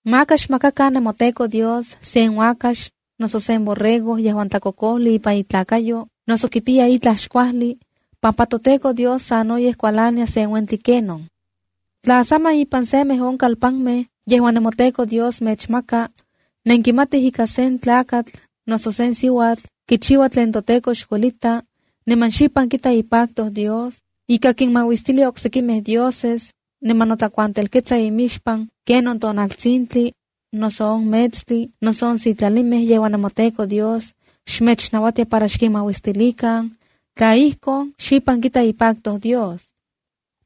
’Maka xmakakan nemoTEKO Dios sen uakax, noso sen borrego yejuan tlakokojli ipan itlakayo noso kipiya itlaj xkuajli, pampa toTEKO Dios sanoyej kualania sen uentli kenon. ’Tla saman, ipan semej on kalpanmej yejuan nemoTEKO Dios mechmaka, nenkimatij ika sen tlakatl noso sen siuatl kichiua tlen toTEKO xkuelita, niman xipan kita ipacto Dios, ika kinmauistilia oksekimej dioses niman notlakuantelketsa imixpan kenon tonaltsintli, noso on metstli noso on sitlalimej yejuan nemoTEKO xmechnauatia para xkinmauistilikan, tla ijkon, xipan kita ipacto Dios.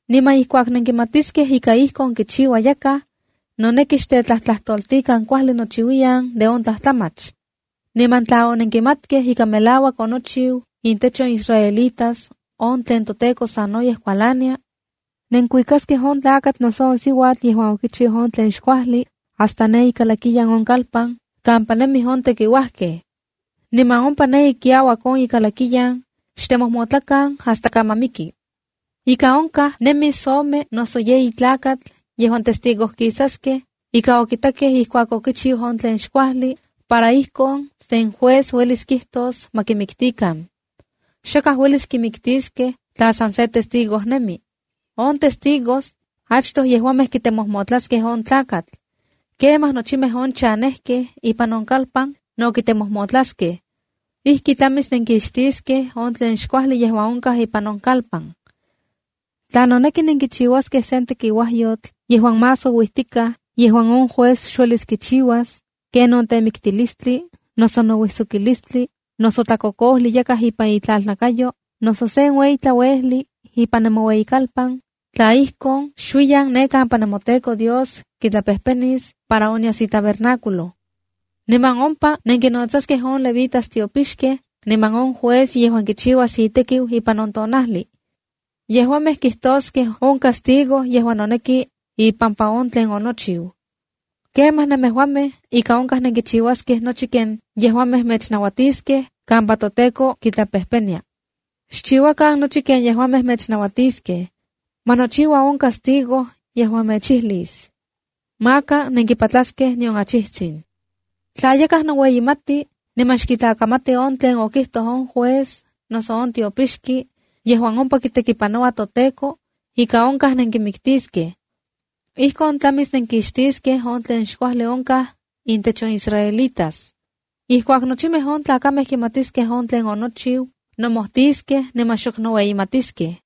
Niman ijkuak nenkimatiskej ika ijkon kichiua yakaj, noneki xtetlajtlajtoltikan kuajli nochiuiyan de on tlajtlamach. Niman tla onenkimatkej ika melauak onochiu intech on israelitas on tlen toTEKO sanoyej kualania, nenkuikaskej on tlakatl noso on siuatl yejuan okichiu on tlen xkuajli hasta ne ikalakiyan on kalpan, kampa nemij on tekiuajkej. Niman ompa ne ikiauak on kalakiyan, xtemojmotlakan hasta kaman miki. ’Ika onkaj nemis ome noso yeyi tlakatl yejuan testigojkisaskej ika okitakej ijkuak okichiu on tlen xkuajli, para ijkon sen juez uelis kijtos ma kimiktikan. Xakaj uelis kimiktiskej tla san se testigo nemi. On testigos achtoj yejuamej kitemojmotlaskej on tlakatl. Kemaj nochimej on chanejkej ipan on kalpan no kitemojmotlaskej. Ijki tlamis nenkixtiskej on tlen xkuajli yejuan onkaj ipan on kalpan. ’Tla noneki nenkichiuaskej sen tekiuajyotl yejuan más ouijtikaj yejuan on juez xuelis kichiuas, kenon temiktilistli, noso nouijsokilistli, noso tlakokojli yakaj ipan itlalnakayo noso sen ueyi tlauejli ipan nemoueyikalpan, tla ijkon, xuiyan ne kampa nemoTEKO Dios kitlapejpenis para onyas itabernáculo. Niman ompa nenkinnotsaskej on levitas tiopixkej niman on juez yejuan kichiuas itekiu ipan on tonajli. Yejuamej kijtoskej on castigo yejuan noneki ipampa on tlen onochiu. Kemaj nemejuamej ika onkaj nenkichiuaskej nochi ken yejuamej mechnauatiskej kampa toTEKO kitlapejpenia. Xchiuakan nochi ken yejuamej mechnauatiskej. Ma nochiua on castigo yejuan mechijlis. Maka nenkipatlaskej nion achijtsin. Tla yakaj noueyimati niman xkitlakamati on tlen okijtoj on juez noso on tiopixki yejuan ompa kitekipanoua toTEKO, ika onkaj nenkimiktiskej. Ijkon tlamis nenkixtiskej on tlen xkuajli onkaj intech on israelitas. Ijkuak nochimej on tlakamej kimatiskej on tlen onochiu nomojtiskej niman xok noueyimatiskej.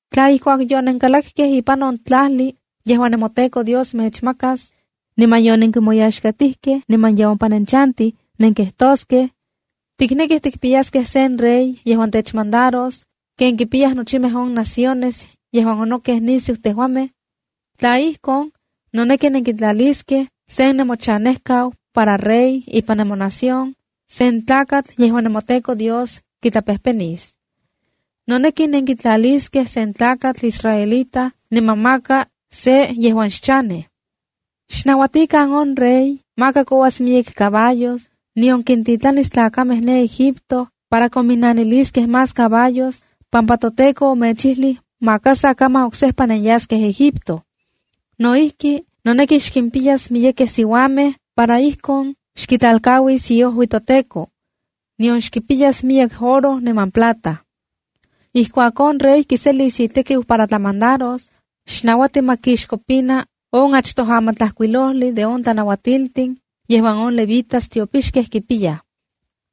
’Tla ijkuak yonenkalakkej ipan on tlajli yejuan nemoTEKO Dios mechmakas, niman yonenkimoyaxkatijkej niman ye ompa nenchantij, nenkijtoskej: ‘Tiknekij tikpiyaskej sen rey yejuan techmandaros ken kipiyaj nochimej on naciones yejuan onokej nisiu tejuamej’, tla ijkon, noneki nenkitlaliskej sen nemochanejkau para rey ipan nemonación, sen tlakatl yejuan nemoTEKO Dios kitlapejpenis. Noneki nenkitlaliskej sen tlakatl israelita niman maka se yejuan xchanej. Xnauatikan on rey, maka kouas miyek caballos, nion kintitlanis tlakamej ne Egipto para kominaniliskej más caballos, pampa toTEKO omechijlij maka sa kaman oksejpa nenyaskej Egipto. No ijki, noneki xkimpiyas miyekej siuamej para ijkon xkitlalkauis iojui toTEKO, nion xkipiyas miyek oro niman plata. ’Ijkuak on rey kiselis itekiu para tlamandaros, xnauati ma kixkopina on achtoj amatlajkuilojli de on tlanauatiltin yejuan on levitas tiopixkej kipiyaj.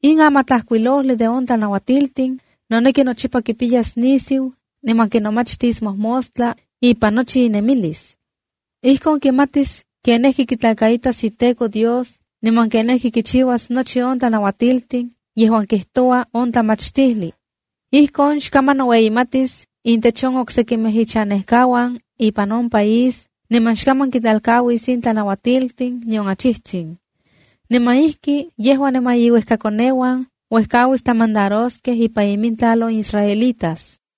In amatlajkuilojli de on tlanauatiltin, noneki nochipa kipiyas nisiu, niman kinomachtis mojmostla ipan nochi inemilis. Ijkon kimatis kenijki kitlakaitas iTEKO Dios niman kenijki kichiuas nochi on tlanauatiltin yejuan kijtoua on tlamachtijli. Ijkon xkaman noueyimatis intech on sekimej ichanejkauan ipan on país niman xkaman kitlalkauis in tlanauatiltin nion achijtsin. Niman ijki yejua niman iuejkakoneuan uejkauis tlamandaroskej ipan imintlal on israelitas.